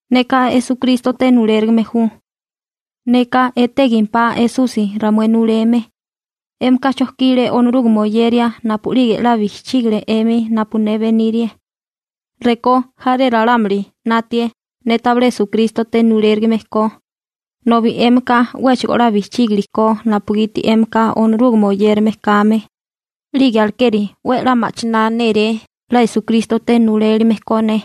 Neka Esukrístote nulérigime ju. Neka etégimpá Esusi ramué nuleme. 'Émika chojkile Onorúgame oyeria napu'lige 'la bijchígile 'emi napu ne benírie. Rekó jaré ralámuli 'natie ne tabilé Esukrístote nulérigime ko, nobi 'émika 'wéchigo 'la bijchígilikó napugiti 'émika Onorúgame oyérame kame, 'lige alekeri 'we 'la ma'chiná néré 'la Esukrístote nulelime ko ne.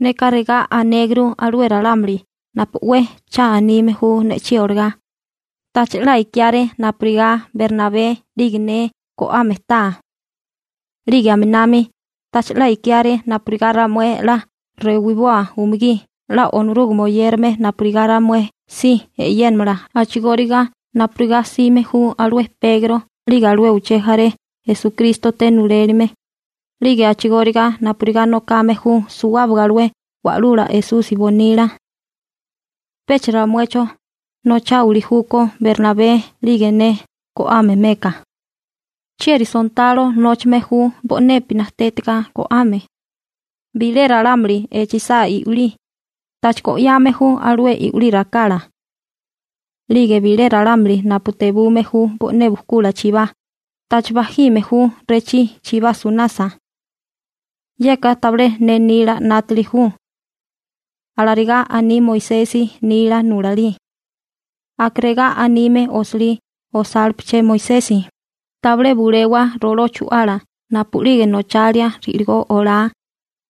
Neka regá anéguru alué ralámuli napu 'we cha anime ju ne'chí olagá: ¿Tacha 'la ikiáré napurigá Bernabé 'lige ne go'ame taa? 'Lige aminami, ¿tacha 'la ikiáré napurigá ramué 'la rewiboa umugí 'la Onorúgame oyérame napurigá ramué si e'yénamala a'chigóriga napurigá 'sime ju alué Pegro 'lige alué uché jaré Esukrístote nulelime, 'lige a'chigóriga napurigá nokame ju suwábaga alué Wa'lula Esusi bonila? ¿Pecha ramuecho nocháwili júkó Bernabé 'lige ne go'ame meka? ¿Chieri sontalo nóchame ju bo'nepi najtétiga go'ame? Bilé ralámuli echisá i'wilí, ¿tacha go'yame ju alué i'wilí rakala? 'Lige bilé ralámuli napu tebume ju bo'né bukula chibá, ¿tacha bajime ju rechí chibá sunasa? Yeka tabilé ne nila 'nátili ju. Alarigá aní Moisesi nila nulalí. Aka regá anime osilí osálipeché Moisesi: «Tabilé bulewa roló chu'ala napu'lige nochalia ri'ligó olá,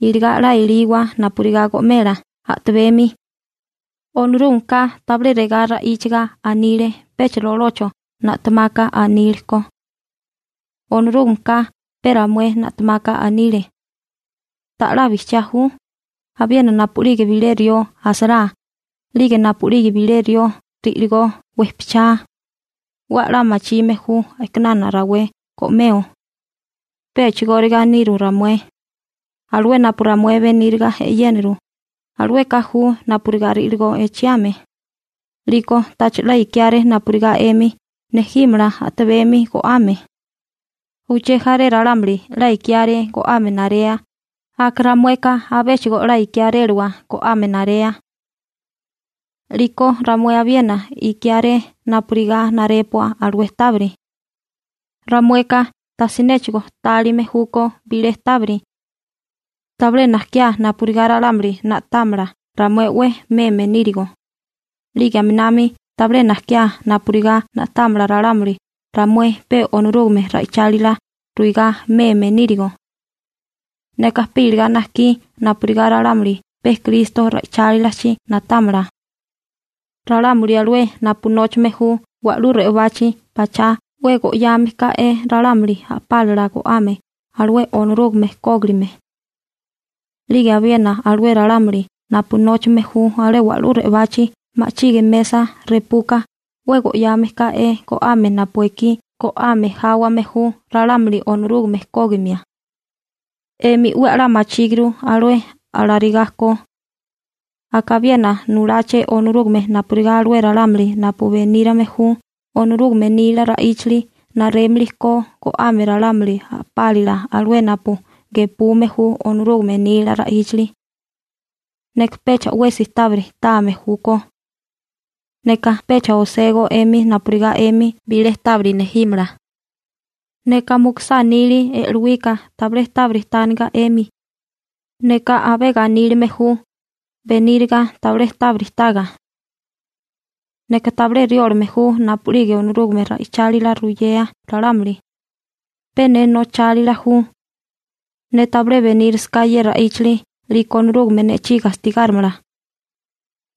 iligá 'la eliwa napurigá go'mela a'tabemi.» Onorúgameka tabilé regá ra'íchiga anile pecha rolocho na'temaka anile ko. Onorúgameka pe ramué na'temaka anile. ¿Ta'lá bijchiá ju? Abiena napu'lige bilé rió asará, 'lige napu'lige bilé rió ri'ligó wejpichá, 'we a'lá machime ju a'kinana rawé go'meo. Pe a'chigóriga niru ramué. Alué napu ramué beníriga e'yéniru, alueka ju napurigá ri'ligó echiame. 'Liko tacha 'la ikiáré napurigá 'emi nejímala a'tabemi go'ame. Uché jaré ralámuli 'la ikiáré go'ame narea, ramueka abéchigo 'la ikiáréliwa go'ame narea. 'Liko ramué abiena ikiáré napurigá narépua alué tábiri. Ramueka tajsinéchigo tálime júkó bilé tábiri. Tabilé najkiá napurigá ralámuli na'támala ramué 'we meme nírigo, 'lige aminami tabilé najkiá napurigá na'támala ralámuli ramué pe Onorúgame ra'ichálila ruigá meme nírigo. Neka pe iligá najkí napurigá ralámuli pe Kristo ra'ichálilachi na'támala. Ralámuli alué napu nóchame ju wa'lú re'obachi pachá 'we go'yame ká'é ralámuli a'pálala go'ame alué Onorúgame kógilime. 'Lige abiena alué ralámuli napu nóchame ju alé wa'lú re'obachi ma'chige mesa repuka 'we go'yame ká'é go'ame napu ekí go'ame jáwame ju ralámuli Onorúgame kógimia. 'Emi 'we a'lá machíguru alué alarigá ko. Aka abiena nuláché Onorúgame napurigá alué ralámuli napu benírame ju Onorúgame nila ra'íchali narémili ko go'ame ralámuli a'pálila alué napu gepume ju Onorúgame nila ra'íchali. Neka pecha 'wesi tábiri táame júkó. Neka pecha oségó 'emi napurigá 'emi bilé tábiri nejímala. Neka mukusá nili e'lowika tabilé tábiri tániga 'emi. Neka abé ganílame ju beníriga tabilé tábiri taga. Neka tabilé riólame ju napu'lige Onorúgame ra'ichálila ruyea ralámuli. Pe ne nochálila ju. Ne tabilé benírasaká ye ra'íchali 'liko Onorúgame ne'chí gastigárimala.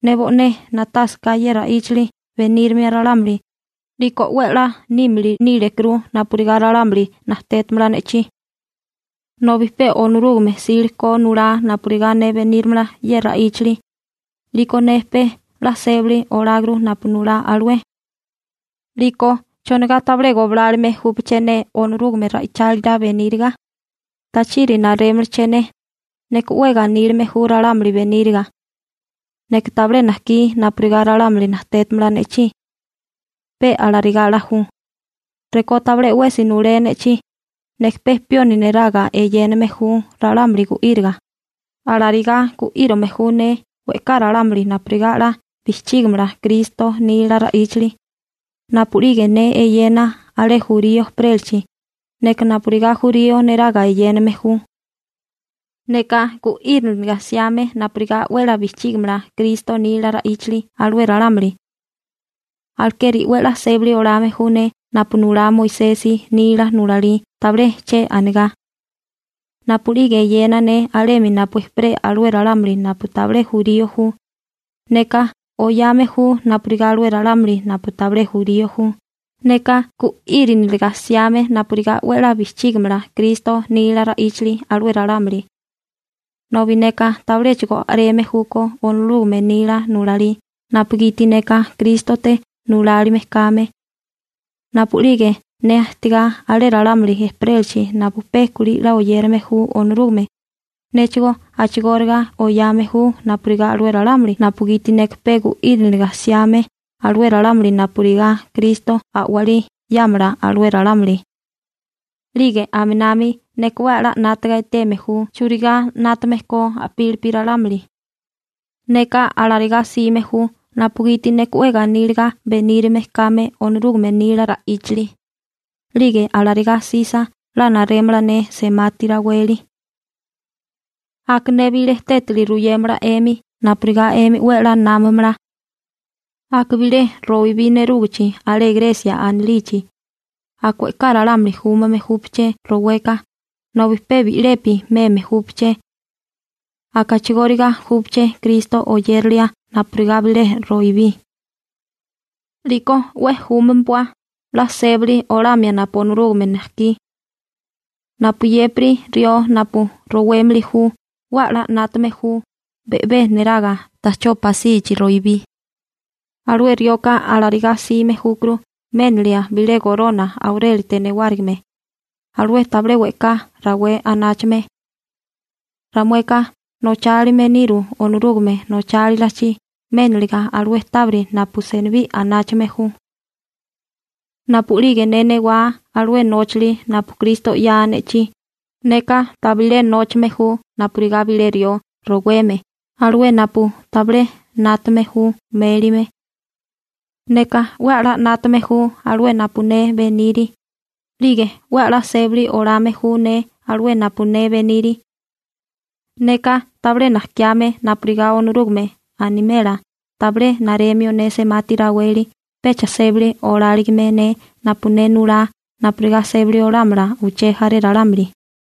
Ne bo'né na'tásaká ye ra'íchali benírimia ralámuli, 'liko 'we 'la nímili nílekuru napurigá ralámuli najtétamala ne'chí. Nobi pe Onorúgame 'sile ko nulá napurigá ne benírimala ye ra'íchali, 'liko ne pe 'la sébali oláguru napu nulá alué. 'Liko ¿chonigá tabilé goblálome júpaché ne Onorúgame ra'ichálila beníriga? ¿Tachiri narémalaché ne? Neka 'we ganílame ju ralámuli beníriga. Neka tabilé najkí napurigá ralámuli najtétamala ne'chí. Pe alarigá 'la ju. Rekó tabilé 'wesi nulé ne'chí, neka pe pioni neraga eyéname ju ralámuli gu'íriga. Alarigá gu'írame ju ne we'ká ralámuli napurigá 'la bijchígimala Kristo nila ra'íchali. Napu'lige ne eyena alué jurío ejperélachi, neka napurigá jurío neraga eyéname ju. Neka gu'íriniliga 'siame napurigá 'we 'la bijchígamala Kristo nila ra'íchali alué ralámuli. Alekeri 'we 'la sébali olame ju ne napu nulá Moisesi nila nulalí tabilé che anigá. Napu'lige eyena ne alemi napu ejperé alué ralámuli napu tabilé jurío ju, neka oyame ju napurigá alué ralámuli napu tabilé jurío ju, neka gu'íriniliga 'siame napurigá 'we 'la bijchígamala Kristo nila ra'íchali alué ralámuli. Nobi neka tabiléchigo a'reme júkó Onorúgame nila nulalí napugiti neka Krístote nulalime kame. Napu'lige ne ajtigá alué ralámuli ejperélachi napu pe kulí 'la oyérame ju Onorúgame, néchigó a'chigóriga oyame ju napurigá alué ralámuli napugiti neka pe gu'íriniliga 'siame alué ralámuli napurigá Kristo a'walí 'yámala alué ralámuli. 'Lige aminami neka 'we 'la 'nátaga eteme ju churigá 'nátame ko a'pílipi ralámuli. Neka alarigá 'sime ju napugiti neka 'we ganíliga benírime kame Onorúgame nila ra'íchali, 'lige ne alarigá 'sisa 'la narémala ne semati raweli. Aka ne bilé tétali ruyémala 'emi napurigá 'emi 'we 'la námamala. Aka bilé roibí nerúgichi alé Gresia anilichi, aka we'ká ralámuli júmame júpaché roweka, nobi pe bi'lepi meme júpaché. Aka a'chigóriga júpaché Kristo oyérilia napurigá bilé roibí. 'Liko 'we júmpua 'la sébali olamia napu Onorúgame najkí. Napuyépiri rió napu rowémili ju, 'we a'lá 'nátame ju be'bé neraga ta'chó pasichi roibí. Alué rioka alarigá 'sime júkuru ménilia bilé gorona aurélite newárigime, alué tabilé we'ká rawé anáchame. Ramueka nochálime niru Onorúgame nochálilachi méniliga alué tábiri napu senibí anáchame ju. Napu'lige ne newá alué nóchali napu Kristo 'yaa ne'chí, neka tabilé nóchame ju napurigá bilé rió roweme alué napu tabilé 'nátame ju mélime. Neka 'we 'la 'nátame ju alué napu ne beniri, 'lige 'we 'la sébali olame ju ne alué napu ne beniri. Neka tabilé najkiame napurigá Onorúgame animela tabilé naremio ne semati raweli pecha sébali oláligime ne napu ne nulá napurigá sébali olámala uché jaré ralámuli.